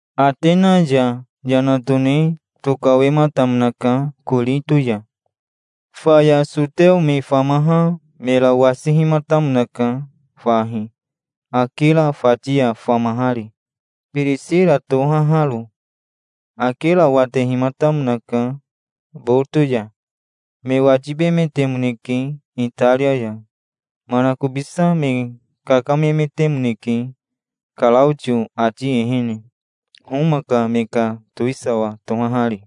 Atena ya yana tone tokawematamonaka Korito ya. Faya soteo me famaha mera wasihimatamonaka fahi, Akira fati ya famahari, Birisira tohaharo. Akira watehimatamonaka Boto ya. Me watibemetemoneke Itaria ya. Manakobisa me kakamemetemoneke Karaotio ati ehene, Homa ka me ka towisawa tohahari.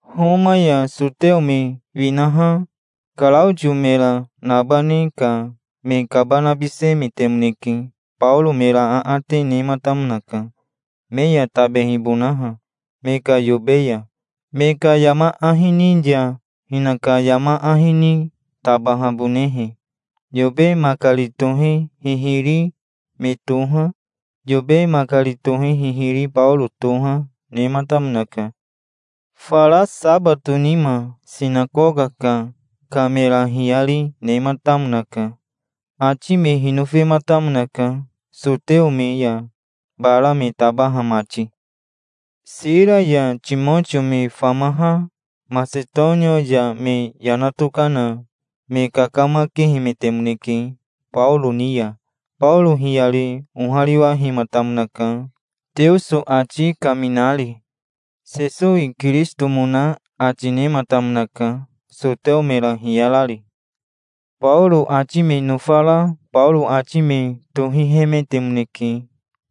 Homa ya soteo me winaha Karaotio mera nabane ka me kabanabisemetemoneke. Baoro mera aate nematamonaka, me ya tabehibonaha, me ka yobe ya, me ka yama ahi ni ya hinaka yama ahi ni tabahabonehe. Yobe makari tohe hihiri me toha, yobe makari tohe hihiri Baoro toha, nematamonaka. Fara sabato nima sinakoka ka mera hiyari nematamonaka. Ati me hinofematamonaka, soteo me ya bara me tabaha mati. Sira ya Timotio me famaha Masetonia ya me yana tokana me kakamakehemetemoneke Baoro ni ya. Baoro hiyari ohariwahematamonaka, Teoso ati kaminari. Sesowi Kirisitomona ati nematamonaka, soteo mera hiyarari. Baoro ati me nofara Baoro ati me tohihemetemoneke.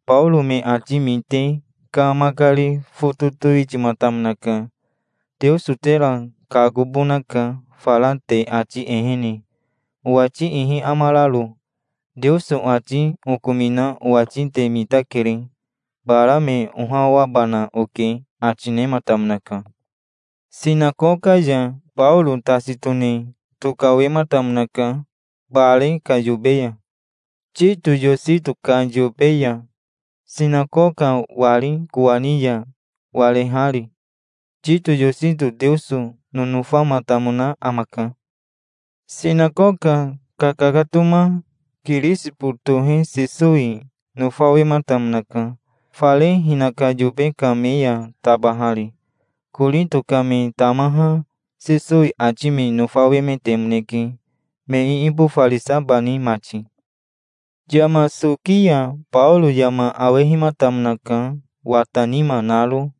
Baoro me ati mite ka makari foto towitimatamonaka. "Teoso tera kakobonaka, fara te ati ehene, owati ihi amararo. Teoso ati okomina owati te mitakere. Bara me ohawabana oke", ati nematamonaka. Sinakoka ya Baoro tasi tone tokawematamonaka bare ka yobe ya, Tito Yosito ka yobe ya, sinakoka wari kowani ya warehari. Tito Yosito Teoso nonofamatamona amaka. Sinakoka kakakatoma Kirisibo tohe Sesowi nofawematamonaka, fare hinaka yobe ka me ya tabahari. Korito ka me tamaha Sesowi ati me nofawemetemoneke, me iibofarisabani mati. Yama soki ya Baoro yama awehimatamonaka wata nima naro.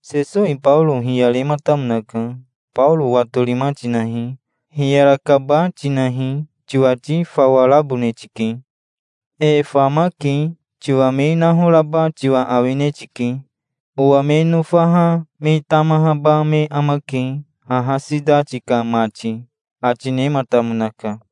Sesowi Baoro hiyarematamonaka. "Baoro watorima tinahi. Hiyarakaba tinahi. Tiwati fawa rabone tike. E famake. Tiwa me nahoraba tiwa awine tike. Owa me nofaha me tamahaba me amake, haha sitati ka mati", ati nematamonaka.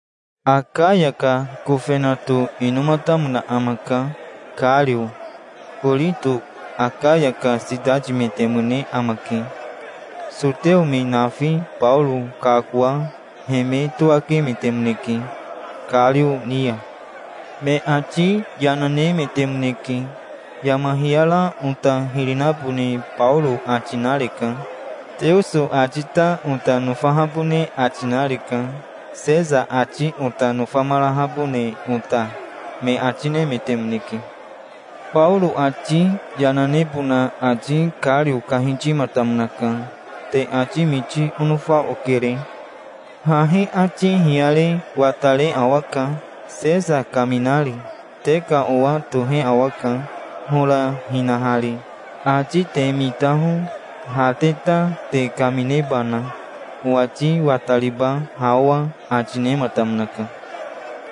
Akaya ka kofenato inomatamona amaka, Kario. Korito Akaya ka sitatimetemone amake. Soteo me nafi Baoro kakoa he me towakemetemoneke Kario ni ya. Me ati yana nemetemoneke. "Yama hiyara ota hiri nabone Baoro ati nareka. Teoso ati ta ota nofahabone ati nareka, Sesa ati ota nofamarahabone ota", me ati nemetemoneke. Baoro ati yana nebona ati Kario kahitimatamonaka. "Te ati miti onofa okere. Hahi ati hiyare watare awaka, Sesa kaminari. Te ka owa tohe awaka, hora hinahari. Ati te mitaho, ha te ta, te kaminebana. Owati watariba, ha owa", ati nematamonaka.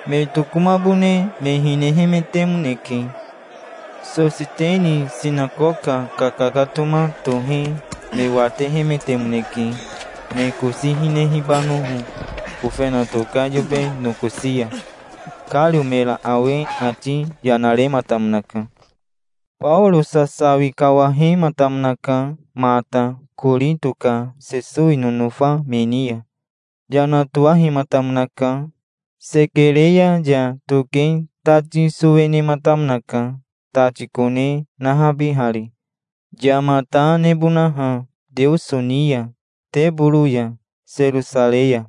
Me tokomabone me hinehemetemoneke. Sositeni sinakoka kakakatoma tohe me watehemetemoneke, me kosi hinehibanoho, kofenato ka yobe nokosi ya. Kario mera awe ati yana rematamonaka. Baoro sasawi kawahematamonaka mata Korito ka Sesowi nonofa me ni ya. Yana towahematamonaka. Sekerea ya toke tati sowe nematamonaka, tati kone nahabihari, yama ta nebonaha Teoso ni ya teboro ya, Serosarei ya.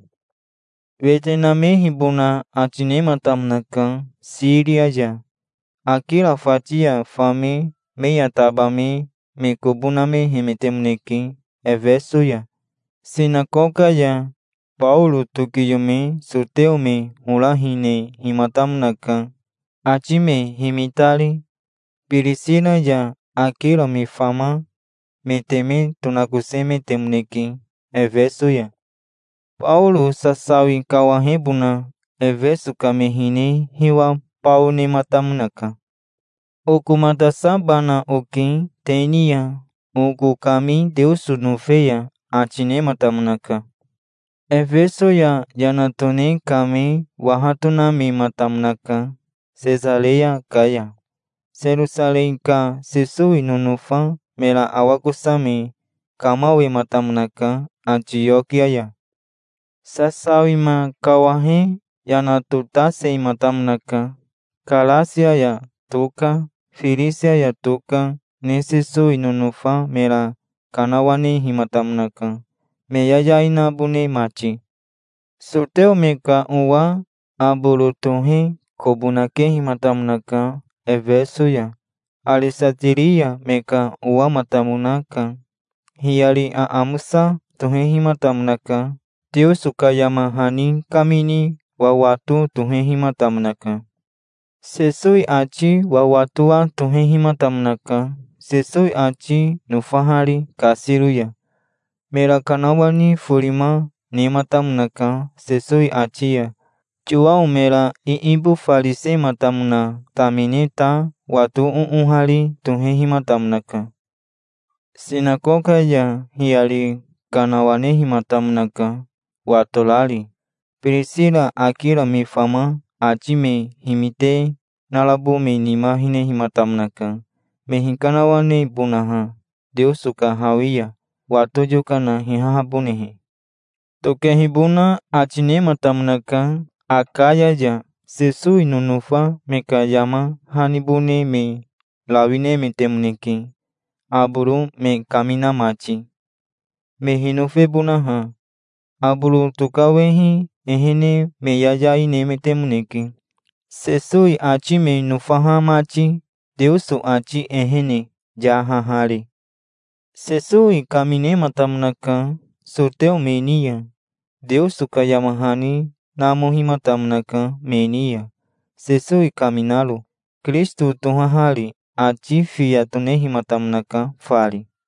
Wete namehibona ati nematamonaka Siria ya. Akira fati ya fame me ya tabame me kobo namehemetemoneke Efeso ya. Sinakoka ya Baoro tokiyome soteo me hora hinehimatamonaka, ati me himitari. Birisira ya Akira me fama me teme tonakosemetemoneke Efeso ya. Baoro sasawi kawahebona Efeso ka me hine hiwa bao nematamonaka. "Okomatasabana oke te ni ya, oko kami Teoso nofe ya", ati nematamonaka. Efeso ya yana tone kame waha tonamematamonaka Sesareya ka ya. Serosarei ka Sesowi nonofa mera awakosame kamawematamonaka Atiokia ya. Sasawima kawahe yana totasematamonaka. Karasia ya toka Firisia ya toka ne Sesowi nonofa mera kanawanehimatamonaka, me yayai nabone mati. Soteo me ka owa Aboro tohe kobo nakehimatamonaka Efeso ya. Aresatiria me ka owamatamonaka. Hiyari aamosa tohehimatamonaka. Teoso ka yama hani kamini wawato tohehimatamonaka. Sesowi ati wawatowa tohehimatamonaka, Sesowi ati nofahari kasiro ya. Mera kanawani forima nematamonaka Sesowi ati ya. Yowao mera iibofarisematamona tamine ta wato oohari tohehimatamonaka. Sinakoka ya hiyari kanawanehimatamonaka, watorari. Birisira Akira me fama ati me himite narabo me nima hinehimatamonaka, me hikanawanebonaha, Teoso ka hawi ya, wato yokana hihahabonehe. Tokehibona ati nematamonaka Akaya ya. Sesowi nonofa me ka yama hanibone me rawi nemetemoneke, Aboro me kamina mati, me hinofebonaha. Aboro tokawehi ehene me yayai nemetemoneke, Sesowi ati me nofaha mati, Teoso ati ehene, yahahari. Sesowi kaminematamonaka soteo me ni ya. Teoso ka yama hani namohimatamonaka me ni ya, Sesowi kaminaro, Kirisito tohahari. Ati fiya tonehimatamonaka fari.